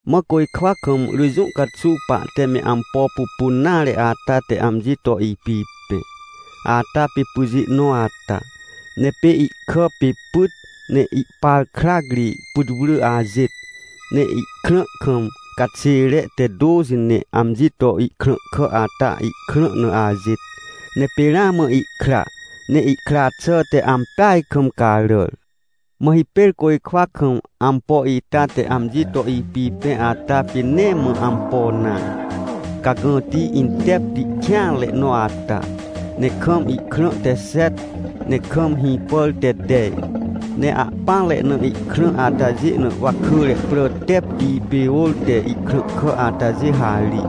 Mã côjkwa kam rỳ jũ caxuw pahte me ampo pupun nare ata te amji to ipipẽ. Ata pê pyjê nõ ata. Ne pê ihkà pê pyt, ne ihpar krac ri putwrỳ ajêt, ne ihkrã kam caxêre te tôxi ne amji to ihkrãhkà ata ihkrã na ajêt. Ne pê ramã ihkra, ne ihkra xà te ampeaj kam caràr. Mã hipêr côjkwa kam ampo ita te amji to ipipẽ ata pê nee mã ampo nare, cagãti intepti kêanre nõ ata, ne kam ihkrã te xet, ne kam hĩpàr te tej. Ne ahpỹanre na ihkrã atajê na wakỳre prà tepti pê ôr te ihkrãhkà atajê harij.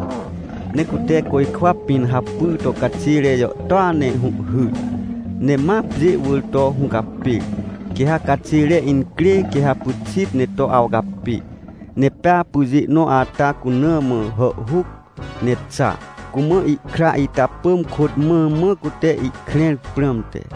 Ne cute côjkwa pĩn hapy to caxêre jàhtôa ne hũhhyr, ne ma pjê wỳr to hũcapêr. Quê ha caxêre incrê quê ha pyxit ne to awcapê. Ne pea pyjê nõ ata cuna mã hàhhuc ne xa, cumã ihkra ita pỳm kôt mãmã, cute ihkrẽr prãmte.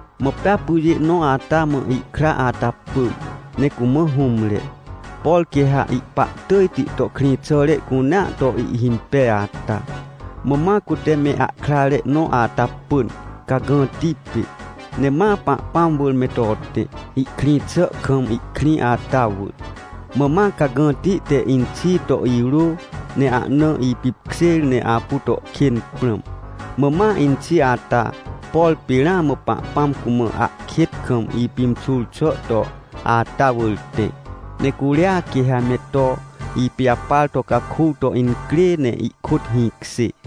Mã pea pyjê nõ ata mã ihkra ata pỳm, ne cumã hũmre, por quê ha ihpa tỳjti to krĩxàre cunea to ihhimpej ata. Mã ma cute me ahkrare nõ ata pỳn, cagãti pê, ne ma Pahpãm wỳr me to tẽ, ihkrĩ xà kam ihkrĩ ata wỳr. Mã ma cagãti te inxi to irô, ne ahna ipipkjêr ne apu to kên prãm. Mã ma inxi ata, por pê ramã Pahpãm cumã ahkêt kam ipimxur xà to ata wỳr tẽ, ne curia quê ha me to ipijapar to caku to incrê ne ihkôt hĩkjê.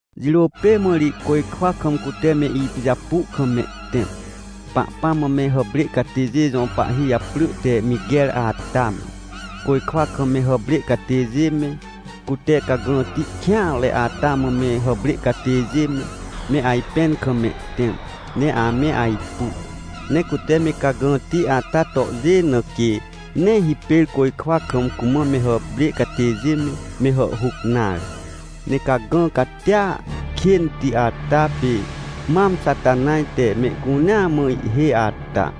Jirô pê mã ri côjkwa kam cute me ipijapu kam mehtẽm. Pahpãm mã me hàprê catêjê jõ pahhi japrỳ te Miquer ata me, côjkwa kam me hàprê catêjê me, cute cagãti kêanre ata mã me hàprê catêjê me, me ajpẽn kam mehtẽm, ne ame ajpu. Ne cute me cagãti ata tohjê, na quê nee hipêr côjkwa kam cumã me hàprê catêjê me, me hàhhuc nare. Ne cagã catia kênti ata, pê mam Xatanaj te mehcunea mã ihhêj ata.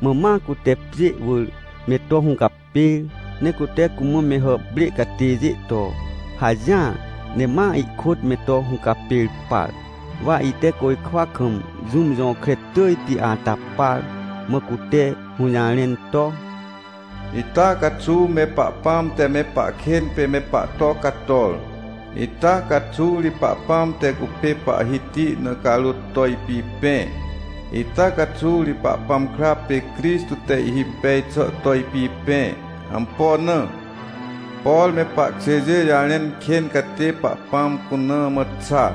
Mã ma cute pjê wỳr me to hũcapêr, ne cute cumã me hàprê catêjê to hajỹar, ne ma ihkôt me to hũcapêr par. Wa ite côjkwa kam jũm jõkre tỳjti ata par, mã cute hũjarẽn to: — Ita caxuw me Pahpãm te me pahkên pê me pahto cator! Ita caxuw ri Pahpãm te cupê Pahhiti na carôt to ipipẽ! Ita caxuw ri Pahpãm kra pê Crixtô te ihhimpej xà to ipipẽ. Ampo na? Por me pahkjêjê jarẽn kên catê Pahpãm cuna mã xa,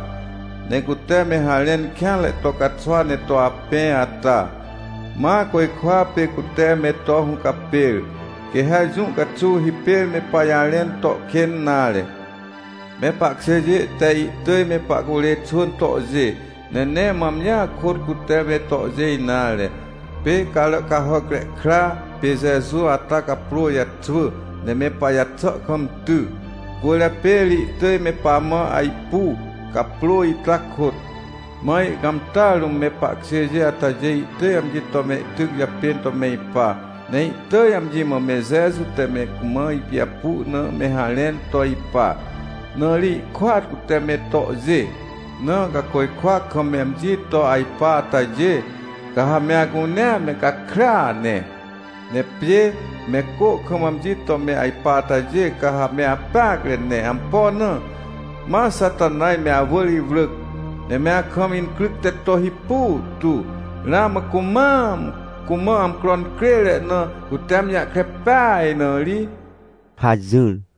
ne cute me harẽn kêanre to caxwa ne to apẽ ata, ma côjkwa pê cute me to hũcapêr, quê ha jũ caxuw hipêr me pajarẽn to kên nare. Me pahkjêjê te ihtỳj me pahcurê xwỳn tohjê. Ne nee mã amjia kôt cute me tohjê nare. Pê Caràcahàcre Kra pê Jeju ata caprô jaxwỳ, ne me pajaxà kam ty. Cwỳrjapê ri ihtỳj me pamã ajpu, caprô ita kôt. Mã ihcãmtà rũm me pahkjêjê atajê ihtỳj amji to mehtyc japên to me ipa. Ne ihtỳj amji mã me Jeju te me cumã ipijapu na me harẽn to ipa, na ri ihkôat cute me tohjê. Na ca côjkwa kam me amji to ajpa atajê, ca ha me acunea me gakrya ne! Ne pjê me cô kam amji to me ajpa atajê, ca ha me apeacre ne. Ampo na? Ma Xatanaj me awỳr iwrỳc, ne me akam incryc te to hipu tu ramã cumam cumã amcro incrêre na cute amji jahkre pej na ri — hajỹr.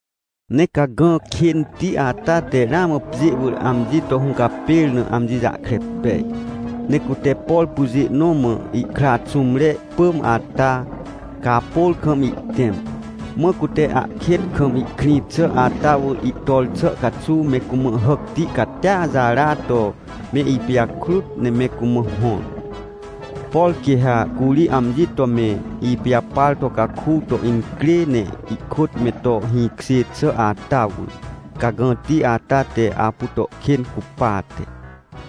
Ne cagã kênti ata te ramã pjê wỳr amji to hũcapêr na amji jahkre pej, ne cute, por pyjê nõ mã ihkra xũmre pỳm ata, caapôr kam ihtẽm. Mã cute ahkêt kam ihkrĩ xà ata wỳr ihtor xà caxuw me cumã hàcti catia jara to me ipijakrut ne me cumã hõr. Por quê ha curi amji to me ipijapar to caku to incrê ne ihkôt me to hĩkjê xà ata wỳr, cagãti ata te apu to kên cupate.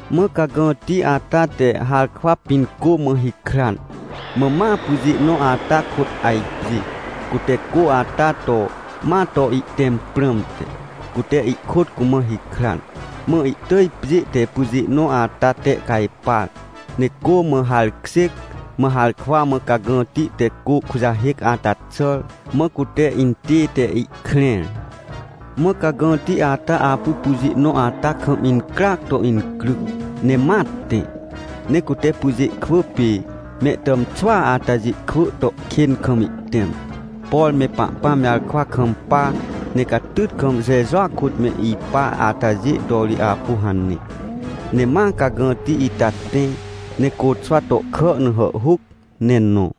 Mã cagãti ata te harkwa pĩn cô mã hikran. Mã ma pyjê nõ ata kôt ajpjê, cute cô ata to, ma to ihtẽm prãmte, cute ihkôt cumã hikran. Mã ihtỳj pjê te pyjê nõ ata tehcajpar, ne cô mã harkjêc. Mã harkwa mã cagãti te cô kujahêc ata xàr, mã cute intête ihkrẽr. Mã cagãti ata apu pyjê nõ ata kam incryac to incryc, ne ma tẽ, ne cute pyjê kwỳ pê mehtàmxwỳa atajê kwỳ to kên kam ihtẽm. Por me Pahpãm jarkwa kampa, ne catyt kam Jejua kôt me ipa atajê to ri apu hane. Ne ma cagãti ita tẽ ne côxwa tohkà na hàhhuc ne nõ.